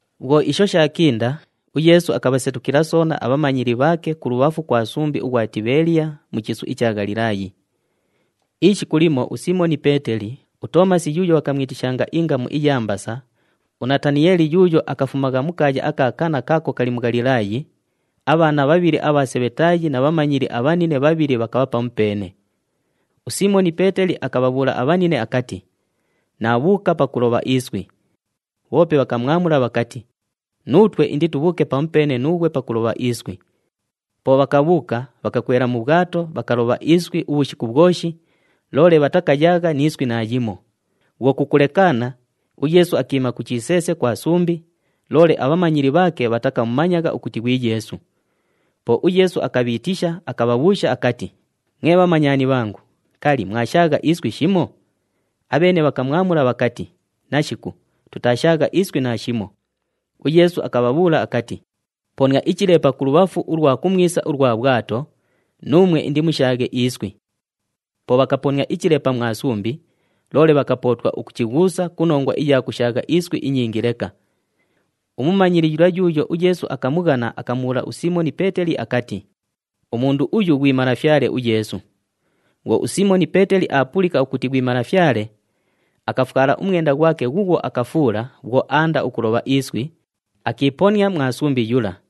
Bhwo isho shaakinda, uYeesu akabhasetukila soona abhamanyili bhaake kulubhafu kwa sumbi ughwa Tibheeliya, mu chiisu icha Ghalilaayi. Ishiku limo uSiimoni Peeteli, uToomasi yuuyo bhakamwitishanga ingamu iya Mbasa, uNataniyeeli yuuyo akafumagha mu kaaya aka Kana kaako kali mu Ghalilaayi, abhaana bhabhili abha Sebhetaayi na bhamanyili abhanine bhabhili bhakabha pamupeene. USiimoni Peeteli akabhabhuula abhanine akati, “Naabhuuka pakulobha iswi.” Bhoope bhakamwamula bhakati, “Nuutwe inditubhuuke pamupeene nuughwe pakulobha iswi.” Po bhakabhuuka, bhakakwela mu bhwato, bhakalobha iswi ubhushiku bhwoshi, loole bhatakayaagha ni iswi naayimo. Bhwo kukulekaana, uYeesu akiima ku chiseese kwa sumbi, loole abhamanyili bhaake bhatakamumanyagha ukuti ghwi Yeesu. Po uYeesu akabhiitisha, akabhabhuusha akati, “Mwe bhamanyani bhangu, kali, mwashaagha iswi shimo?” Abheene bhakamwamula bhakati, “Nashiku, tutaashaagha iswi naashimo.” UYeesu akabhabhuula akati, “Ponia ichilepa kulubhafu ulwa kumwisa ulwa bhwato, nuumwe indimushaaghe iswi.” Po bhakaponia ichilepa mwa sumbi, loole bhakapootwa ukuchighuusa ku nongwa iya kushaagha iswi inyingi leka. Umumanyili yula yuuyo uYeesu akamughana akamubhuula uSiimoni Peeteli akati, “Umundu uyu ghwi Malafyale uYeesu!” Bhwo uSiimoni Peeteli aapulika ukuti ghwi Malafyale, akafwala umwenda ghwake ghuughwo akafuula bhwo aanda ukulobha iswi, akiiponia mwa sumbi yula.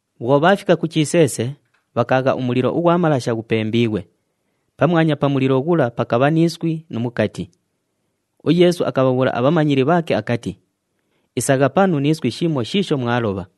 Bhwo bhaafika ku chiseese, bhakaagha umulilo ughwa malasha ghupembiighwe. Pamwanya pa mulilo ghula pakabha ni iswi nu mukati. UYeesu akabhabhuula abhamanyili bhaake akati, “Isagha panu ni iswi shimo shiisho mwalobha.”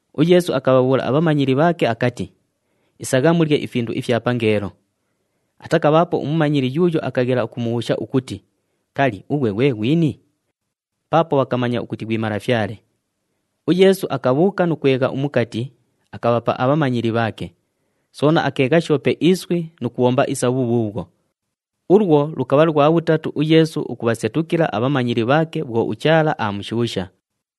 UYeesu akabhabhuula abhamanyili bhaake akati, “Isagha mulye ifindu ifya pangeelo.” Atakabhaapo umumanyili yuuyo akaghela ukumubhuusha ukuti, “Kali, ughwe ghwe ghwini?” Paapo bhakamanya ukuti ghwi Malafyale. UYeesu akabhuuka nu kwegha umukati, akabhapa abhamanyili bhaake. Soona akeegha shoope iswi nu kubhomba isa bhubhuubhwo. Ulwo lukabha lwa bhutatu uYeesu ukubhasetukila abhamanyili bhaake bhwo uChaala aamushuusha.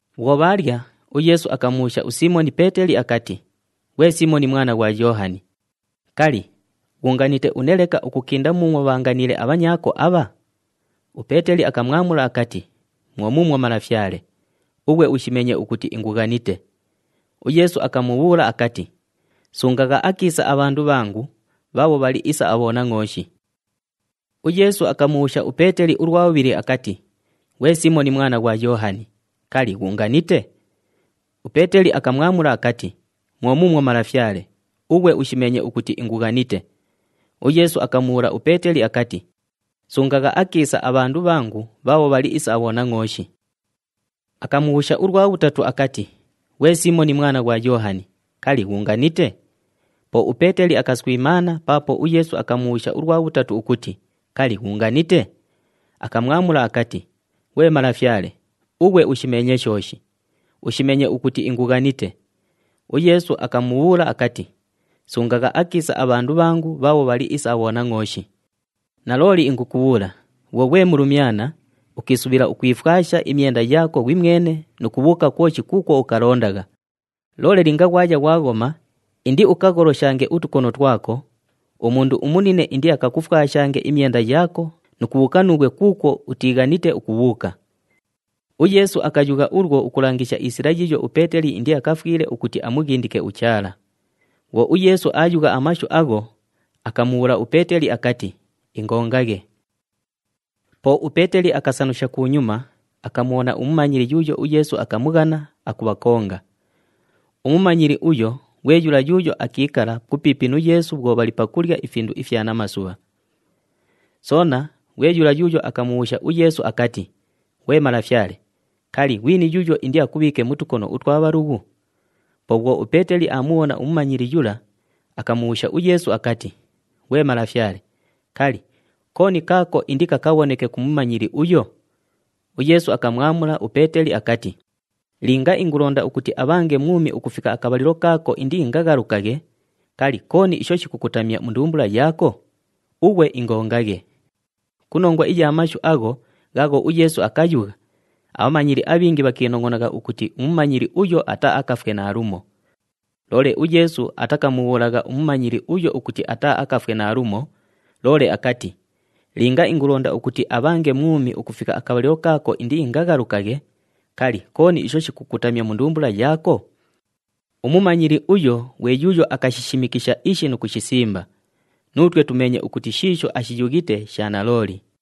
Bhwo bhaalya, uYeesu akamubhuusha uSiimoni Peeteli akati, “Ghwe Siimoni mwana ghwa Yoohani, kali, ghuunganite une leka ukukinda muumwo bhaanganiile abhanyaako abha?” UPeeteli akamwamula akati, “Mwo muumwo Malafyale, ughwe ushimeenye ukuti ingughanite.” UYeesu akamubhuula akati, “Sungagha akiisa abhandu bhangu bhaabho bhali isa abhonangʼooshi.” UYeesu akamubhuusha uPeeteli ulwa bhubhili akati, “Ghwe Siimoni mwana ghwa Yoohani, kali, ghuunganite?” UPeeteli akamwamula akati, “Mwo muumwo Malafyale, ughwe ushimeenye ukuti ingughanite.” UYeesu akamubhuula uPeeteli akati, “Sungagha akiisa abhandu bhangu bhaabho bhali isa abhonangʼooshi.” Akamubhuusha ulwa bhutatu akati, “Ghwe Siimoni mwana ghwa Yoohani, kali, ghuunganite?” Po uPeeteli akaswimaana paapo uYeesu akamubhuusha ulwa bhutatu ukuti, “Kali, ghuunganite?” Akamwamula akati, “Ghwe Malafyale, ughwe ushimeenye shooshi. Ushimeenye ukuti ingughanite.” UYeesu akamubhuula akati, “Sungagha akiisa abhandu bhangu bhaabho bhali isa abhonangʼooshi. Nalooli ingukubhuula, bhwo ghwe mulumyana, ukiisubhila ukwifwasha imyenda yaako ghwimwene nu kubhuuka kwoshi kuukwo ukalondagha. Loole linga ghwaya ghwaghoma, indiukagholoshange utukono twako, umundu umunine indiakakufwashange imyenda yaako nu kubhuuka nuughwe kuukwo utiighanite ukubhuuka.” UYeesu akayugha ulwo ukulangisha isila yiiyo uPeeteli indiakafwile ukuti amughindike uChaala. Bhwo uYeesu aayugha amashu agho, akamubhuula uPeeteli akati, “Ingongaghe.” Po uPeeteli akasanusha kunyuma, akamubhona umumanyili yuuyo uYeesu akamughana, akubhakonga. Umumanyili uyo ghwe yula yuuyo akiikala kupiipi nu Yeesu bhwo bhali pakulya ifindu ifya namasubha. Soona, ghwe yula yuuyo akamubhuusha uYeesu akati, “Ghwe Malafyale, kali, ghwini yuuyo indiakubhiike mu tukono utwa bhalughu?” Po bhwo uPeeteli aamubhona umumanyili yula, akamubhuusha uYeesu akati, “Ghwe Malafyale, kali, kooni kaako indikakabhoneke ku mumanyili uyo?” UYeesu akamwamula uPeeteli akati, “Linga ingulonda ukuti abhange mwumi ukufika akabhalilo kaako indiingaghalukaghe, kali, kooni isho shikukutamya mu ndumbula yaako? Ughwe ingongaghe.” Ku nongwa iya mashu agho ghaagho uYeesu akayugha, abhamanyili abhingi bhakiinongʼonagha ukuti umumanyili uyo ataaakafwe naalumo. Loole uYeesu atakamubhuulagha umumanyili uyo ukuti ataaakafwe naalumo, loole akati, “Linga ingulonda ukuti abhange mwumi ukufika akabhalilo kaako indiingaghalukaghe, kali, kooni isho shikukutamya mu ndumbula yaako?” Umumanyili uyo ghwe yuuyo akashishimikisha ishi nu kushisimba. Nuutwe tumeenye ukuti shiisho ashiyughite sha nalooli.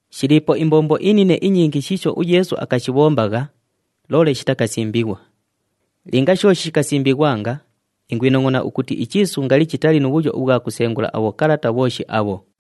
Shiliipo imbombo inine inyingi shiisho uYeesu akashibhombagha, loole shitakasimbighwa. Linga shooshi shikasimbighwanga, ingwinongʼona ukuti ichiisu ngali chitali nu bhuyo ubhwa kusengula abhokalata bhooshi abho.